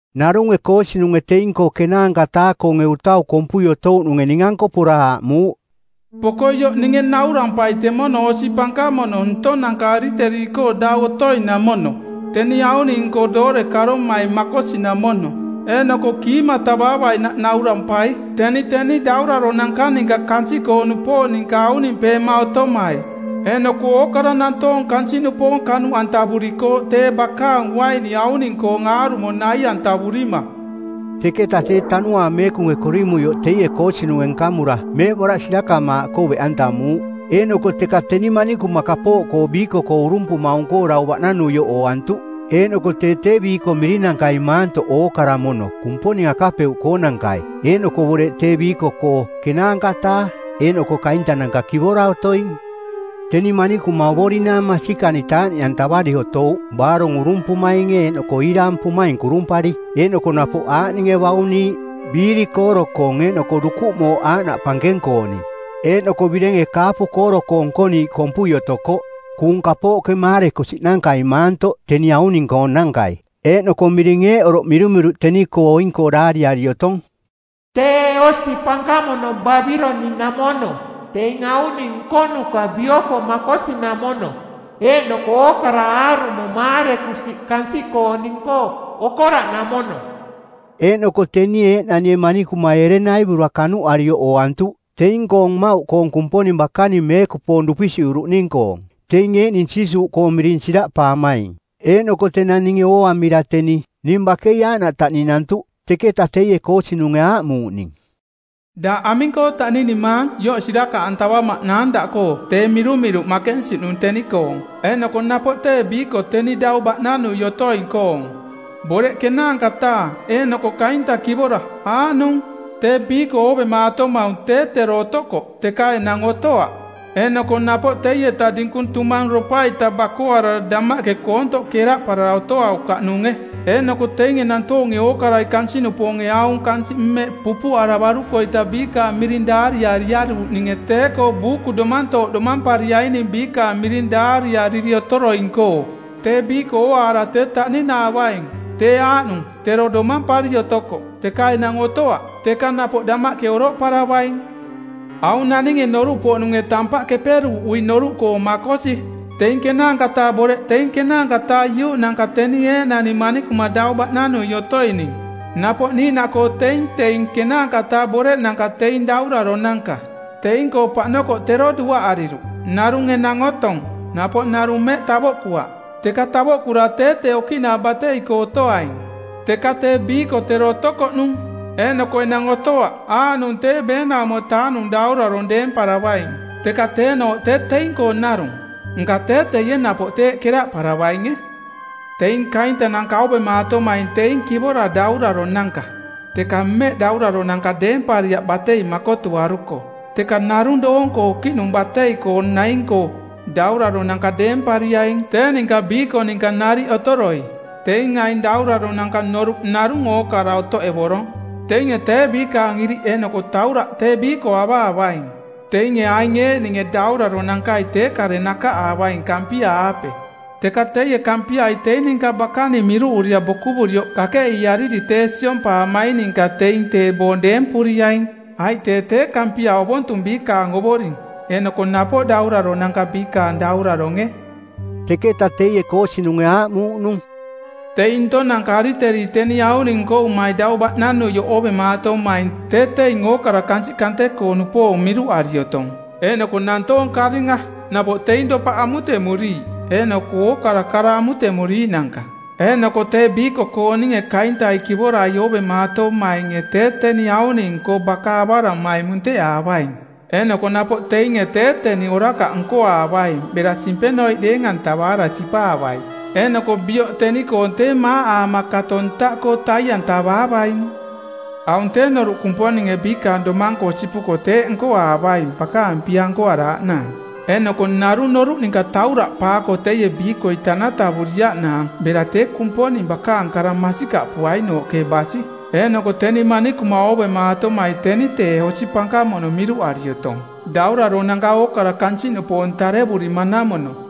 Narunge koosinunge teing-koo ˜kenaanka-taa-koonge utau kompui otouꞌnunge ning-anko pora aaꞌmuuꞌ, “Poko ioꞌ ninge naurampai temono osi pankamono ntonanka ariteri-koo dau otoinamono, teni auning-nko doore karomai makosinamono, eeꞌnoko kiimatavaavainaꞌ naurampai. Teni teni dauraronanka ninka kansiꞌkoo-nupoong ninka aunimpeema otomai eeꞌnoko ookara nantoong kansiꞌnupoong kanuꞌantavurikooꞌ tee bakaang uaini auning-koong aarumo nai-antavurima.” Teketa tee Tanuaang Meekunge korimuioꞌ teie koosinunge nkamura meeꞌboraꞌ sirakamaaꞌkoo beꞌantamuuꞌ, eeꞌnoko teka teni manikuma kapooꞌkoo biiko-koo urumpumaung-koo dau baꞌnanuioꞌ ooantuꞌ. Eeꞌnoko tee tee biiko mirinankai maantoꞌ ookara mono Kumponing akapeuꞌkoonankai eeꞌnoko boreꞌ tee biiko-koo ˜kenaanka-taa eeꞌnoko kaintananka kivora otoing. Teni manikuma ovorinaang masikani taaꞌniꞌantavari otouꞌ baarong urumpumainge eeꞌnoko iiraampumaing kurumpari. Eeꞌnoko napoꞌ aaꞌninge bauniiꞌ: biiri kooro-koong eeꞌnoko dukuꞌ mooꞌ aaꞌnaꞌ pankeng-kooning. Eeꞌnoko birenge kaapu kooro-koo nkoniiꞌ kompui otokoꞌ, kuung kapooꞌke maarekusiꞌnankai maantoꞌ teni auning-koonankai. Eeꞌnoko miring eeꞌ oroꞌ mirumiruꞌ teni-koo oing-koo daariari otong: TEE OSI PANKAMONO BABILONIꞌNAMONO, TEING AUNING NKONUKA BIOKO MAKOSINAMONO, EEꞌNOKO OOKARA AARUMO MAAREKUSIꞌ KANSIꞌKOONING-KOO OKORAꞌNAMONO. Eeꞌnoko teni eeꞌnanie manikumai ereng naivura kanuꞌarioꞌ ooantuꞌ teing-koong mmauꞌkoong Kumponing bakaning meekupoong dupisiꞌuruꞌning-koong, teing eeꞌning Jiisuuꞌkoo miring siraꞌpaamaing. Eeꞌnoko tenang ninge ooamira teni, ning bakei aaꞌnaꞌ taꞌninantuꞌ. Teketa teie koosinunge aaꞌmuuꞌ ning, “Daꞌ aming-koo taꞌninimaang? Ioꞌ sirakaꞌantavamaꞌnaang daꞌkoo tee mirumiruꞌ makensiꞌnung teni-koong eeꞌnoko napoꞌ tee biiko teni dau baꞌnanui otoing-koong, boreꞌ ˜kenaanka-taa eeꞌnoko kainta kivora aaꞌnung. Tee biiko oovemaatomaung tee tero otokoꞌ, teka enang otoaꞌ. Eeꞌnoko napoꞌ teieta dinkung tumangropa-ita bakoarara damaꞌke koontoꞌ keraꞌparara otoaukaꞌnunge. Eeꞌnoko teinge nantoonge ookarai kansiꞌnupoonge aung kansiꞌ mmeꞌ pupuꞌaravaruko-ita biikaang miring daariariaruuꞌninge tee-koo buuku domantooꞌ domampariaining biikaang miring daariariri otoroing-koo, tee biiko ooaara tee taꞌninaavaing. Tee aaꞌnung tero domampari otokoꞌ, teka enang otoaꞌ, teka napoꞌ damaꞌke oroꞌparavaing. Aung naninge noruꞌpoꞌnunge tampaꞌ keperuuꞌui noruꞌkoo makosi. Teing ˜kenaanka-taa boreꞌ teing ˜kenaanka-taa iuꞌnanka teni eeꞌnani manikuma dau baꞌnanui otoining. Napoꞌ niiꞌnaꞌkoo teing teing ˜kenaanka-taa boreꞌnanka teing dauraronanka. Teing-koo paꞌnokoꞌ tero duaꞌariruꞌ, narung enang otong, napoꞌ narung mmeꞌ tavoꞌkuaꞌ, teka tavoꞌkura tee tee okiꞌnaa batei-koo otoaing. Teka tee biiko tero otokoꞌnung, eeꞌnoko enang otoaꞌ aaꞌnung tee ˜beenaumo-taa-nung daurarong˜ deemparavaing. Teka teenooꞌ tee teing-koong narung. Nka tee teie, napoꞌ teeꞌ keraꞌparavainge. “Teing kaintananka oovemaatomaing teing kivora dauraronanka, teka mmeꞌ dauraronanka deempariaꞌ batei makotuaruko, teka narung doong-koo okiꞌning batei naing-koo, dauraronanka deempariaing tee ninka biiko ninka nariꞌ otoroi. Teing aing dauraronanka noruꞌ narung ookara otoꞌevorong. Teinge tee biikaang iriꞌ eeꞌnoko tauraꞌ tee biiko avaavaing. Teinge aing eeꞌninge dauraronankai tee kare nakaꞌaavaing Kampia-aape, teka teie Kampiai teing ninka bakaning miruꞌurira bokuvurioꞌ kakeꞌiiariri tee siompaamaing ninka teing tee boong deempuriaing, aiꞌ tee tee Kampia ovontung biikaang Ovoring eeꞌnoko napoꞌ dauraronanka biikaang Dauraronge.” Teketa teie koosinunge aaꞌmuuꞌnung, “Teing ntong-nanka ariteri teni auning nkovumai dau baꞌnanuioꞌ oovemaatomaing tee teing ookara kansiꞌ kante-koo-nupoong miruꞌari otong, eeꞌnoko nantoong karinga, napoꞌ teing dopaꞌ amutemuriiꞌ eeꞌnoko ookara kara amutemuriiꞌnanka. Eeꞌnoko tee biiko-kooninge kaintai kivorai oovemaatomainge tee teni auning-koo baka avaramai munteꞌaavaing. Eeꞌnoko napoꞌ teinge tee teni orakaꞌ nkoaavaing bera simpenoiꞌ deeng-antavaara sipaavai. Eeꞌnoko bioꞌ teni-koong tee maaꞌaama kato ntaꞌkoo tai-antavaavaing. Aung tee noruꞌ Kumponinge biikaang domang-koo sipuko teeꞌ nkoaavaing bakaang pia nkoaraaꞌnaang, eeꞌnoko narung noruꞌ ninka tauraꞌpaako teie biikoi tanatavuriaꞌnaang bera tee Kumponing bakaang kara masikaꞌpuainooꞌke basi. Eeꞌnoko teni manikuma oovemaatomai teni tee osi pankamono miruꞌari otong, dauraronanka ookara kansiꞌnupoong tarevurima-namono.”